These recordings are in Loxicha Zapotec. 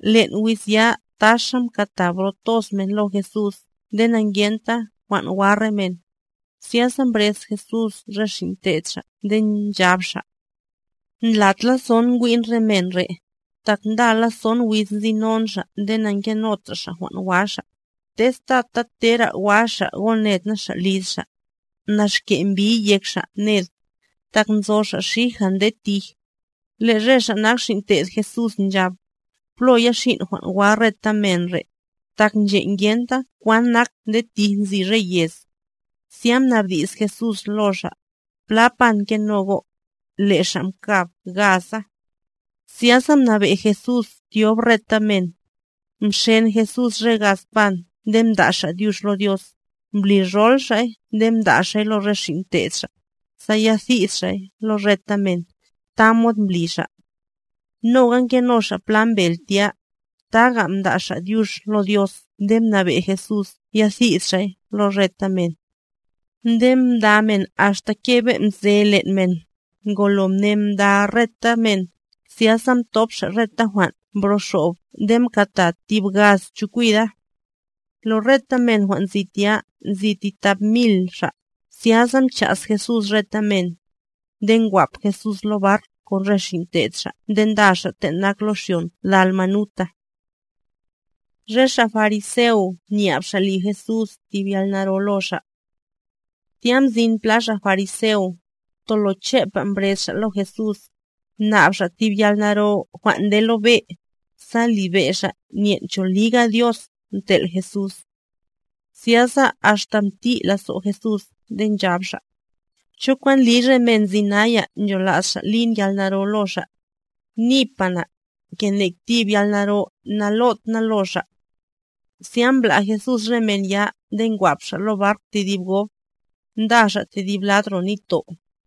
Len' wiz ya taxa mkata bro toz men lo Jesús nde na'ngenta jwan' wa re men. Zyasa mbrez Jesús re xin' te'd Xa' nde nchab Xa': —Ndlat lazo'n ngwin re men re', tak ndala son wiz nzinon xa' nde na'ngenotra xa' jwan' wa xa', tez tata tera wa xa' goned na xa' liz xa', nax ke' mbiy yek xa' ned, tak nzo xa' xija nde tij. Le' re xa nak xin' te'd Jesús nchab: —¿Plo ya xin' jwan' wa reta men re', tak nche' ngenta kwan nak nde tij nzi re yez? Zya mnabdi's Jesús lo xa': —¿Pla pan ngeno go'? Le' xa' mkab: —Gaza. Zyasa mnabe' Jesús tyob reta men; mxen Jesús re gaz pan nde mda' Xa' dyux lo Dios, mblirol Xa'y nde mda' Xa'y lo re xin' te'd Xa', sa ya thid xa'y lo reta men; tamod mbli xa'. Noga ngeno xa' pla mbel tya; taga mda' Xa' dyux lo Dios nde mnabe' Jesús ya thid xa'y lo reta men. Nde mda men axta kebe' mze len' men; ngolo mne mda reta men, zyasa mthop xa' reta jwan' mbroxob nde mkata tib gaz chokwida. Lo reta men jwan' nzi tya, nzi ti thap mil xa', zyasa mcha's Jesús reta men. Nde ngwap Jesús lo bark kon re xin' te'd Xa' nde nda xa' ten' nak lo xyon Dalmanuta. Re xa' fariseo nyab xa' li Jesús tib yalnaro lo xa' Tya mzin pla xa' fariseo, tolo chepa mbrez xa' lo Jesús, mnab xa' tib yalnaro jwan' nde lo be', sa libe' xa' nyen' cho liga Dios mtel' Jesús. Zyasa axta mti' lazo' Jesús nde nchab Xa': —¿Cho kwan ndliy re men nzi naya nchola's xa' lin yalnaro lo xa'? Nipa na, ke nek tib yalnaro nalot na lo xa'. Zya mbla' Jesús re men ya nde ngwap xa' lo bark tedib gob, nda xa' tedib lad ro nitto'.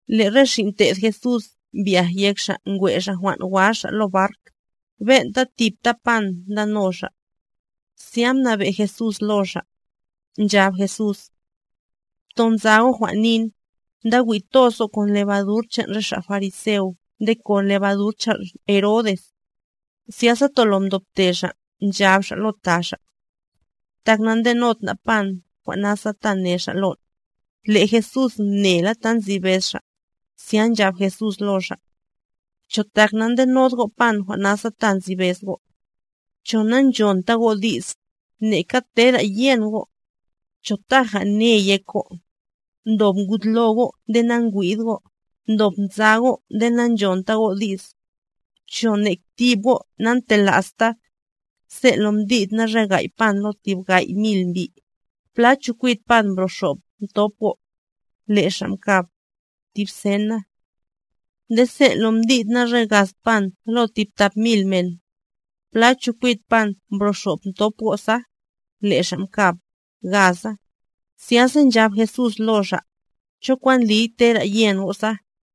Le' re xin' te'd Jesús mbyaj yek xa' ngwe' xa' jwan' wa xa' lo bark, ben'ta tipta pan ndano xa'. Zya mnabe' Jesús lo xa', nchab Jesús: —Pto nza go' jwan' nin, nda wi' toz go' kon lebadur chan' re xa' fariseo nde kon lebadur chan' Herodes. Zyasa tolo mdobte xa' nchab xa' lo ta xa': —Tak nandenod na' pan jwan' nasa ta ne Xa' lon'. Le' Jesús mnela ta nzi bez xa', zya nchab Jesús lo xa': —¿Cho tak na'ndenod go' pan jwan' nasa ta nzi bez go'? ¿Cho na'nchonta go' di's, neka tera yen go'? ¿Cho taja ne yek go'? ¡Ndob ngud lo go' nde nangwid go', ndob nza go' nde nanchonta go' di's! ¿Cho nek tib go' na'ntela'sta? Sen' lo mdid na re gay' pan lo tib gay' mil mbi', ¿pla chokwid pan jwan' mbroxob mthop go'? Le' xa' mkab: —Tib sen na. Nde sen' lo mdid na re gaz pan lo tib tap mil men, ¿pla chokwid pan mbroxob mthop go' sa? Le' xa' mkab: —Gaza. Zyasa nchab Jesús lo xa': —¿Cho kwan ndliy tera yen go' sa?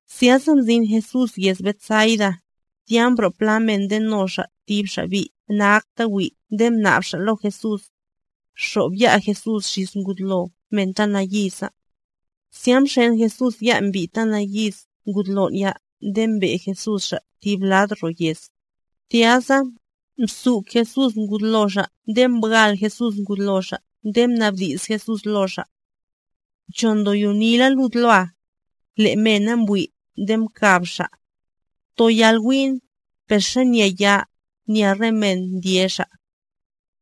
Zyasa mzin Jesús yez Betsaida; tya mbro' pla men ndeno xa' tib xa' bi' na'akta wi' nde mnab xa' lo Jesús, xob ya' Jesús xis ngud lo men ta nayiza. Zya mxen Jesús ya' mbi' ta nayiz ngud lon' ya nde mbe' Jesús xa' tib lad ro yez; tya sa, mzuk Jesús ngud lo xa' nde mbwal Jesús ngud lo xa' nde mnabdi's Jesús lo xa': —¿Cho ndoyonila lud loa? Le' mena mbwi' nde mkab xa': —Toyal wi'n, per xanya ya, nya re men ndye xa'.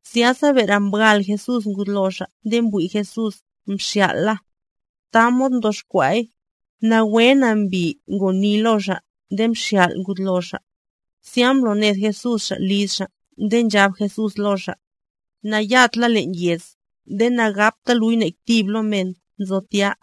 Zyasa bere mbwal Jesús ngud lo xa' nde mbli Jesús mxyal' la. Tamod mtoxkwa'y, nawe nambi ngoni lo xa' nde mxyal' ngud lo xa'. Zya mbloned Jesús xa' liz xa' nde nchab Jesús lo xa': —Na'yad la len' yez nde nagapta luy nek tib lo men nzo tya.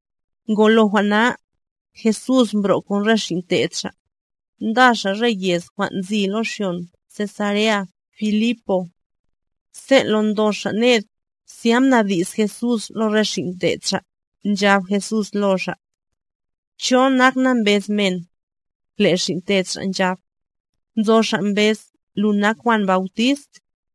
Ngolo jwan' na, Jesús mbro' kon re xin' te'd Xa', nda xa' re yez jwan' nzi lo xyon Cesarea-Filipo. Sen' lo ndo xa' ned, zya mnabdi's Jesús lo re xin' te'd Xa', nchab Jesús lo xa': —¿Cho nak na mbez men? Le' xin' te'd Xa' nchab: —Nzo xa' mbez lu nak Juan Bautist,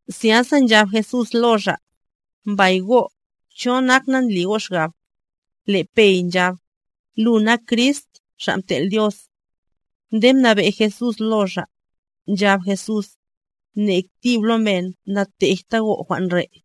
Zyasa nchab Jesús lo xa': —Mbay go', ¿cho nak na ndli go' xgab? Le' Pey nchab: —Lu nak Crist, Xa' Mtel' Dios. Nde mnabe' Jesús lo xa', nchab Jesús: —Nek tib lo men natejta go' jwan' re'.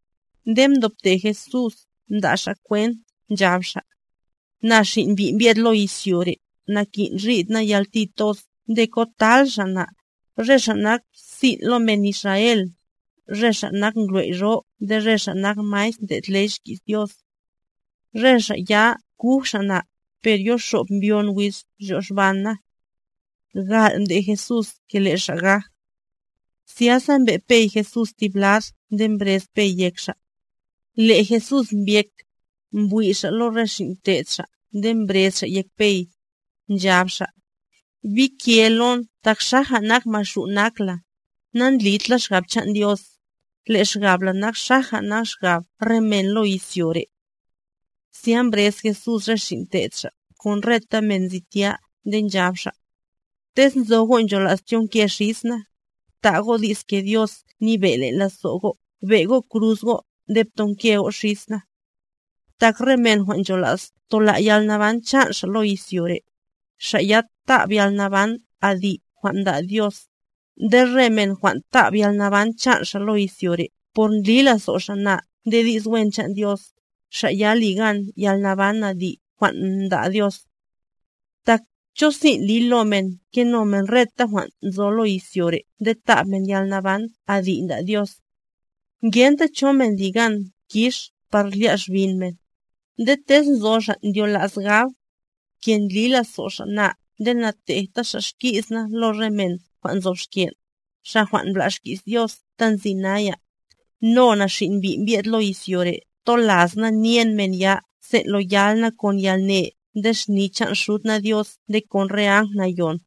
Nde mdobte Jesús mda' xa' kwent, nchab xa': —Na Xin' Mbi' mbye'd lo izyo re', nakin' rid na yalti toz nde kotal xa' na, re xa' nak sin' lo men Israel, re ngwley' jwan' nyebe' nde re xa' nak maestr ndlo' ley xki's Dios. Re xa' ya kuj xa' na, per yoxob mbyon wiz ryoxban na. Gal' mdej Jesús ke le' Xa' gaj. Zyasa mbe' Pey Jesús tib lad nde mbrez Pey yek Xa'. Le' Jesús mbyek, mbwi' Xa' lo re xin' te'd Xa' nde mbrez Xa' yek Pey, nchab Xa': —¡Bike lon tak xaja nak Maxu' nak la! Nandlid la xgab chan' Dios, le' xgab la nak xaja nak xgab re men lo izyo re'. Zya mbrez Jesús re xin' te'd Xa' kon reta men nzi tya nde nchab Xa': —Tez nzo go' nchola's tyonke xis na, bta' go' di's ke Dios nyebe' len' lazo' go', be' go' kruz go' nde ptonke go' xis na. Tak re men jwan' nchola's tola' yalnaban chan' xa' lo izyo re', xa' ya ta'b yalnaban adi' jwan' nda' Dios; nde re men jwan' ta'b yalnaban chan' xa' lo izyo re' por ndli lazo' xa' na nde di's wen chan' Dios, xa' ya ligan yalnaban adi' jwan' nda' Dios. Tak, ¿cho sin' liy lo men keno men reta jwan' nzo lo izyo re' nde tab men yalnaban adi' nda' Dios? Ngenta cho men li gan kix par lya' xbin men. Nde tez nzo xa' ndyola's gab, ke ndli lazo' xa' na nde natejta xa' xki's na lo re men jwan' nzob xken', xa' jwan' mbla' xki's Dios ta nzi naya, no na, Xin' Mbi' mbye'd lo izyo re' tola's na nyen men ya sen' lo yal na kon yalne nde xni chan' Xud na Dios nde kon re áng Nayon.